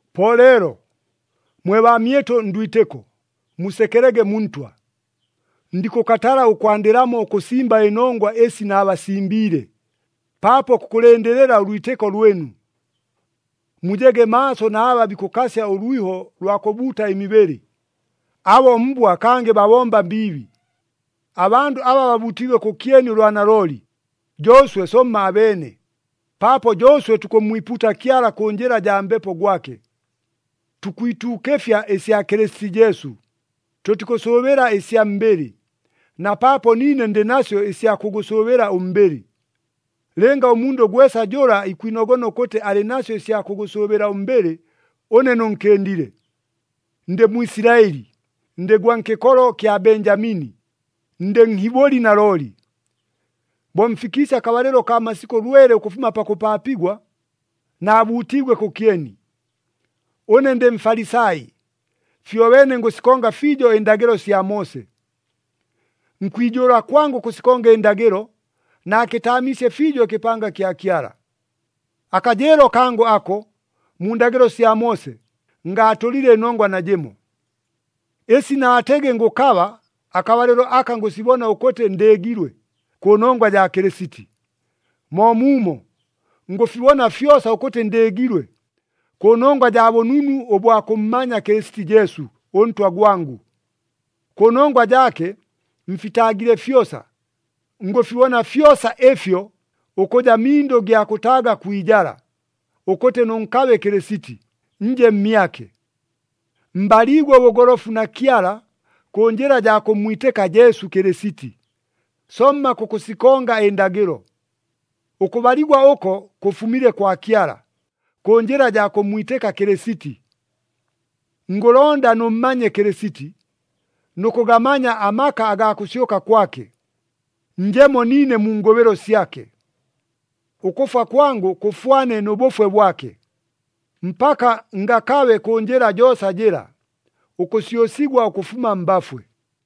Po leelo, mwe baamyɨtʉ ndwitɨko, musekelege mu Ntwa! Ndikʉkatala ʉkwandɨlamo ʉkʉsimba ɨnongwa ɨsi naabasimbiile, paapo kukʉlɨndɨlɨla ʉlwitɨko lwɨnu. Mujege maaso na aba bikʉkasya ʉlwiho lwa kʉbuuta ɨmibɨlɨ! Abo mbwa kangɨ babomba mbiibi. Abandʉ aba babuutiigwe kʉkyeni ʉlwa nalooli, jo ʉswe somma abeene, paapo jo ʉswe tukʉmmwipuuta Kyala kʉ njɨla jaa Mbepo gwake. Tukwituukɨfya ɨsya Kɨlɨsiti Jesu, tʉtikʉsʉʉbɨla ɨsya mbɨlɨ, na paapo niine ndɨ nasyo ɨsya kʉgʉsʉʉbɨla ʉmbɨlɨ. Lɨnga ʉmundʉ gwesa jʉla ikwinogona ʉkʉtɨ alɨ nasyo ɨsya kʉgʉsʉʉbɨla ʉmbɨlɨ, ʉne nʉnkɨndile. Ndɨ Mwisilaɨli, ndɨ gwa nkɨkolo kya Benjamini, ndɨ Nhibʉli nalooli. Bo mfikiisye akabalɨlo kaa masikʉ lwele ʉkʉfuma pakʉpaapigwa, naabuutiigwe kʉkyeni. Ʉne ndɨ Mfalisai, fyobeene ngʉsikonga fiijo ɨndagɨlo sya Moose. Nkwijʉʉla kwangʉ ʉkʉsikonga ɨndagɨlo, naakɨtaamiisye fiijo ɨkɨpanga kya Kyala. Akajɨɨlo kangʉ ako, mu ndagɨlo sya Moose, ngaatʉlile ɨnongwa najɨmo. Ɨsi naatɨgɨ ngʉkaba, akabalɨlo aka ngʉsibona ʉkʉtɨ ndɨɨgilwe, kʉnongwa jaa Kɨlɨsiti. Moomuumo, ngʉfibona fyosa ʉkʉtɨ ndɨɨgilwe, kʉnongwa jaa bʉnunu ʉbwa kʉmmanya Kɨlɨsiti Jesu, ʉNtwa gwangʉ. Kʉnongwa jaake mfitaagile fyosa, ngʉfibona fyosa ɨfyo ʉkʉja mindʉ gya kʉtaaga kwi ijala, ʉkʉtɨ nʉnkabe Kɨlɨsiti, nje mmyake. Mbaliigwe ʉbʉgolofu na Kyala kʉ njɨla jaa kʉmmwitɨka Jesu Kɨlɨsiti, somma kʉkʉsikonga ɨndagɨlo. Ʉkʉbaligwa ʉko kʉfumile kwa Kyala, kʉ njɨla jaa kʉmmwitɨka Kɨlɨsiti. Ngʉlonda nʉmmanye Kɨlɨsiti, nʉ kʉgamanya amaka agaa kʉsyʉka kwake, njemo niine mu ngʉbɨlo syake. Ʉkʉfwa kwangʉ kʉfwane nʉ bʉfwe bwake, mpaka ngakabe kʉ njɨla joosa jɨla, ʉkʉsyʉsigwa ʉkʉfuma mbafwe.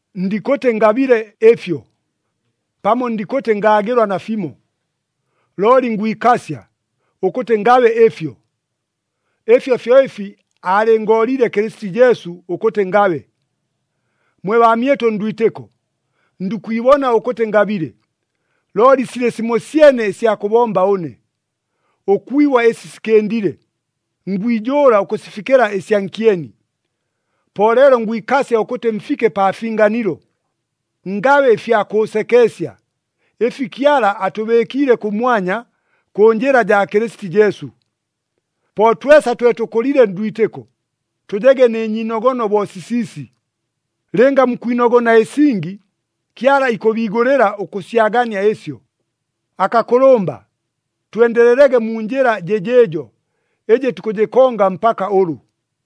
Ndikʉtɨ ngabile ɨfyo, pamo ndikʉtɨ ngaagɨlwa nafimo. Looli ngwikasya, ʉkʉtɨ ngakabe ɨfyo. Ɨfyo fyo ɨfi aalɨngooliile Kɨlɨsiti Jesu ʉkʉtɨ ngabe. Mwe baamyɨtʉ ndwitɨko, ndikwibona ʉkʉtɨ ngabile, looli silɨ simosyene ɨsya kʉbomba ʉne. Ʉkwibwa ɨsi sikɨndile, ngwijʉʉla ʉkʉsifikɨla ɨsya nkyeni. Po leelo ngwikasya ʉkʉtɨ mfike pa finganilo, ngabe ɨfya kʉʉsekeesya, ɨfi Kyala atʉbɨɨkiile kʉmwanya, kʉ njɨla jaa Kɨlɨsiti Jesu. Po twesa twe tʉkʉlile ndwitɨko, tʉjege nɨ nyiinogono bo sisiisi. Lɨnga mukwinogona ɨsingi, Kyala ikʉbiigʉlɨla ʉkʉsyagania ɨsyo. Akakʉlʉmba, twendelelege mu njɨla jɨjɨɨjo, ɨjɨ tukʉjɨkonga mpaka ʉlʉ.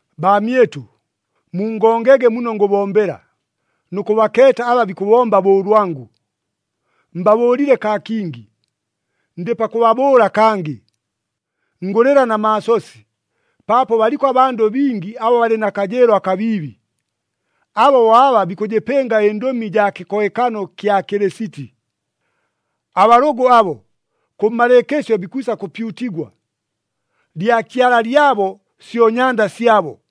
Baamyɨtʉ, mungongege muno ngʉbombela, nʉ kʉbakeeta aba bikʉbomba bo ʉlwangʉ. Mbabʉʉlile kaa kingi, ndɨ pakʉbabʉʉla kangɨ, ngʉlɨla na maasosi, paapo baliko abandʉ bingi aba balɨ na kajɨɨlo akabiibi. Abo bo aba bikʉjɨpɨnga ɨndʉmi jaa kɨkohekano ɨkya Kɨlɨsiti. Abalʉgʉ abo, kʉmmalɨɨkɨsyo bikwisa kʉpyutigwa. Lyakyala lyabo syo nyanda syabo.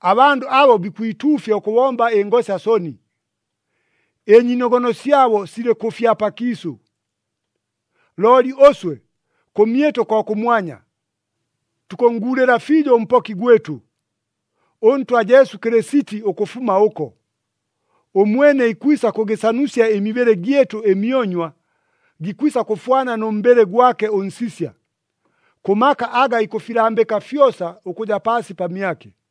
Abandʉ abo bikwituufya ʉkʉbomba ɨngosya soni. Ɨnyiinogono syabo silɨ kʉ fya pakiisʉ. Looli ʉswe, kʉmyɨtʉ ko kʉmwanya. Tukʉnnguulɨla fiijo ʉMpoki gwɨtʉ, ʉNtwa Jesu Kɨlɨsiti ʉkʉfuma ʉko. Ʉmwene ikwisa kʉgɨsanusya ɨmibɨlɨ gyɨtʉ ɨmyonywa, gikwisa kʉfwana nʉ mbɨlɨ gwake ʉnsisya, kʉ maka aga ikʉfilambɨka fyosa ʉkʉja paasi pamyake.